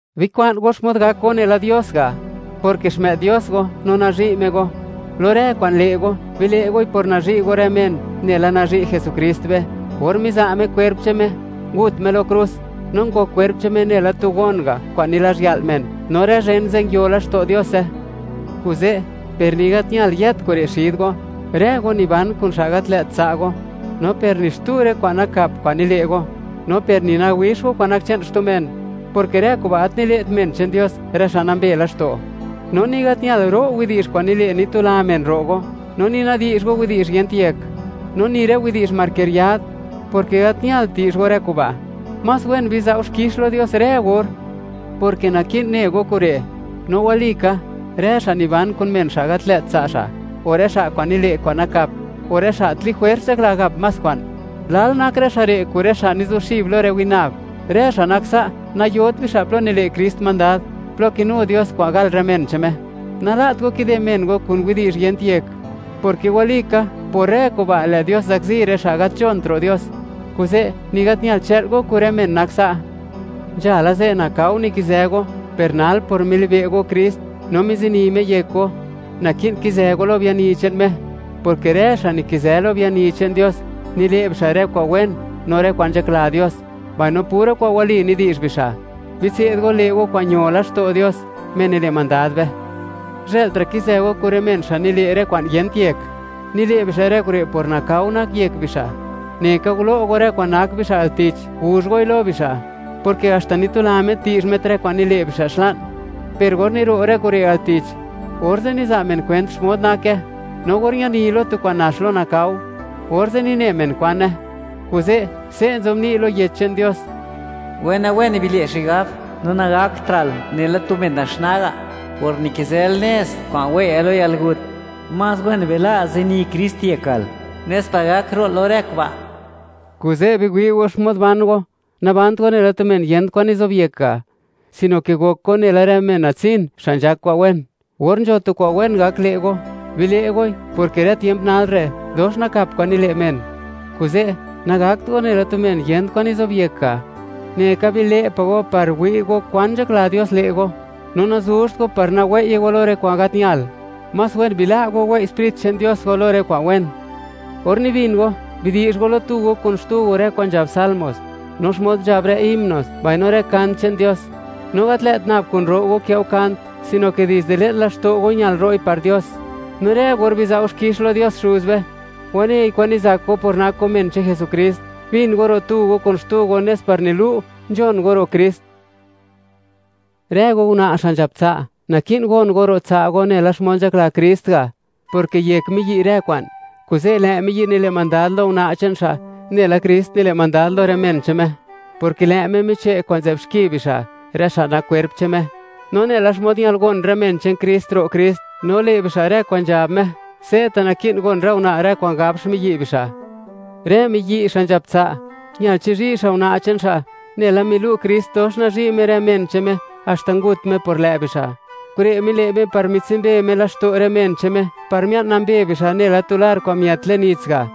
Bikwa'n go xmod gak go nela Dios ga', porke xmë'd Dios go, no nazhi' Me go. Lo rë kwa'n le' go, bile' goi por nazhi' go rë men, nela nazhi' Jesukrist be, or miza' Me kwerp che'n Me, ngut Me lo krus, no ngok kwerp che'n Me nela tu gon ga' kwa'n nilazhya'l men, no rë zhen ze' nguiolaxto' Diose. Kuze', per ni gat ñal yët kure' xid go, rë go niban kun xa' gat lë't tsa' go, no per ni xtu rë kwa'n nakap kwa'n nile' go; no per ni nawix go kwa'n nak che'n xtu men, porke rë kuba' gat nile't men che'n Dios, rë xa' nambe laxto'. No ni gat ñalt, ro' widi'zh kwa'n nile', nitula men ro' go; no ni nadi'zh go widi'zh yent yek; no ni rë widi'zh markeriad; porke gat ñalt di'zh go rë kuba'. Más wen biza' go xkix lo Dios rë or, porke naki'n ne go kure'; no walika, rë xa' niban kun men xa' gat lë't tsa' xa', o rë xa' kwa'n nile' kwa'n nakap, o rë xa' ti jwers nzhakla gap más kwa'n, lal nak rë xa' re' kun rë xa' nizuxib lo rë winab. Rë xa' nak sa' nayot bixa' plo nile' Krist mandad, plo kinu Dios kwa'n gal rë men che'n Me. Nala't go kide men go kun widi'zh yent yek; porke walika, por rë kuba', lë' Dios zakzi rë xa' gat nzhont ro' Dios. Kuze', ni gat ñalt chë'l go kun rë men nak sa'. Nzhala ze', nakao nikizë go; per nal, por milibe' go Krist, no mizini Me yek go, naki'n kizë go lo biani che'n Me, porke rë xa' nikizë lo biani che'n Dios, nile' bixa' rë kwa'n wen no rë kwa'n nzhakla Dios, mbaino pura kwa'n wali nidi'zh bixa'. Bitse'd go le' go kwa'n ño laxto' Dios Me nile' mandad be. Zhë'ltra' kizë go kun rë men xa' nile' rë kwa'n yent yek; nile' bixa' rë kure' por nakao nak yek bixa'; neka gulo' go rë kwa'n nak bixa' al tich, guzh goi lo bixa', porke haxta nitula met di'zh met rë kwa'n nile' bixa' xla'n, per or niro' rë kure' al tich, orze' niza' men kwent xmod nake; no or ñani lo tu kwa'n nax lo nakao, orze' nine men kwane. Kuze', se' nzobni' lo Yech che'n Dios: Wena-wen bile' xigab, no nagaktra'l nela tu men naxnaa ga', por nikizël nez kwa'n wei'yal lo yalgut. Más wen bila' zini Krist yekal, nes par gak ro'l lo rë kuba'. Kuze' biwi' go xmod ban go; nabant go nela tu men yent kwan nizobyekt ga'; sino ke gok go nela rë men natsin, xa' nzhak kwa'n wen. Gor gak le' go tu kwa'n wen, bile' goi, porke rë tiemp nal re', dox nakap kwa'n nile' men. Kuze', nagakt go nela tu men yent kwan nizobyek ga'; neka bile' pa' go par wi' go kwan nzhakla Dios le' go, no nazuzht go par nawei'ye go lo rë kwa'n gat ñal; más wen bila' go, wei' Sprit che'n Dios go lo rë kwa'n wen. Or nibin go, bidi'zh go lo tu go kun xtu go, rë kwa'n nzhab Salmos, no xmod nzhab rë himnos, mbaino rë kant che'n Dios; no gat lë't nab kun ro' go kë' go kant, sino ke dizde le'n laxto' go ñal ro'i par Dios. No rë gor biza' go xkix lo Dios Xuz be, wanei kwan nizak go, por nak go men che'n Jesukrist. Bin go ro' tu go kun xtu go nes par nilu', nzhon go ro' Krist. Rë go una' xa' nzhap tsa', naki'n gon go ro' tsa' go nela xmod nzhakla Krist ga', porke yek miyi' rë kwa'n, kuze' lë' miyi' nile' mandad lo una' che'n xa', nela Krist nile' mandad lo rë men che'n Me, porke lë' Me miche' kwa'n nzë'b xki bixa', rë xa' nak kwerp che'n Me. No nela xmod ñal gon rë men che'n Krist ro' Krist no le' bixa' rë kwa'n nzhab Me, se'ta' naki'n gon rë una' rë kwa'n gab xmiyi' bixa'. Rë miyi' xa' nzhap tsa', ñal chizhi' xa' una' che'n xa', nela milu' Krist, dox nazhi' Me rë men che'n Me, haxta ngut Me por lë' bixa'. Kure' mile' Me par mitsumbe Me laxto' rë men che'n Me, par mia'n nambe bixa' nela tu lar kwa'n miët le'n nits ga',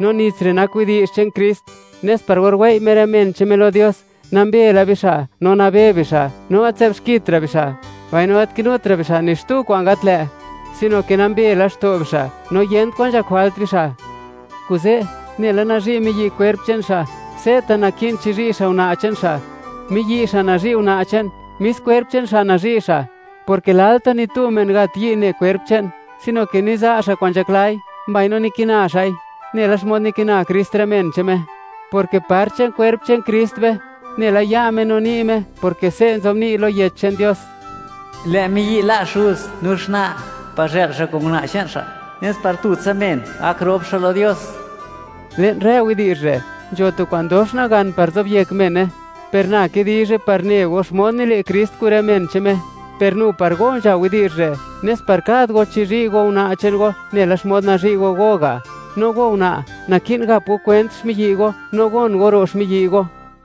no nits re' nak widi'zh che'n Krist, nes par or wei' Me rë men che'n Me lo Dios, nambe la bixa', no nabe bixa', no gat nzë'b xkitra' bixa', mbaino gat kinutra' bixa' ni xtu kwa'n gat lë', sino ke nambe laxto' bixa', no yent kwan nzhak jwalt bixa'. Kuze', nela nazhi' miyi' kwerp che'n miyi', se'ta' naki'n chizhi' xa' una' che'n xa'. Miyi' xa' nazhi' una' che'n, mis kwerp che'n xa' nazhi' xa', porke lalta' ni tu men gat yi' ne kwerp che'n, sino ke niza' xa' kwa'n nzhaklai, mbaino nikina xa'i, nela xmod nikina Krist rë men che'n Me, porke part che'n kwerp che'n Krist be, nela ya' Me no ni' Me, porke se' nzobni' lo Yech che'n Dios: “Lë' miyi' la' xuz no xna', par zhë'l xa' kun una' che'n xa', nes par tutsa men gak rop xa' lo Dios.” Le'n rë widi'zh re', nzho tu kwa'n dox nagan par zobyek mene. Per na kidizhe par ne go xmod nile' Krist kun rë men che'n Me, per nu par go nzha widi'zh re', nes par kad go chizhi' go una' che'n go, nela xmod nazhi' go go; no go una', naki'n gap go kwent xmiyi' go, no gon go ro' xmiyi' go.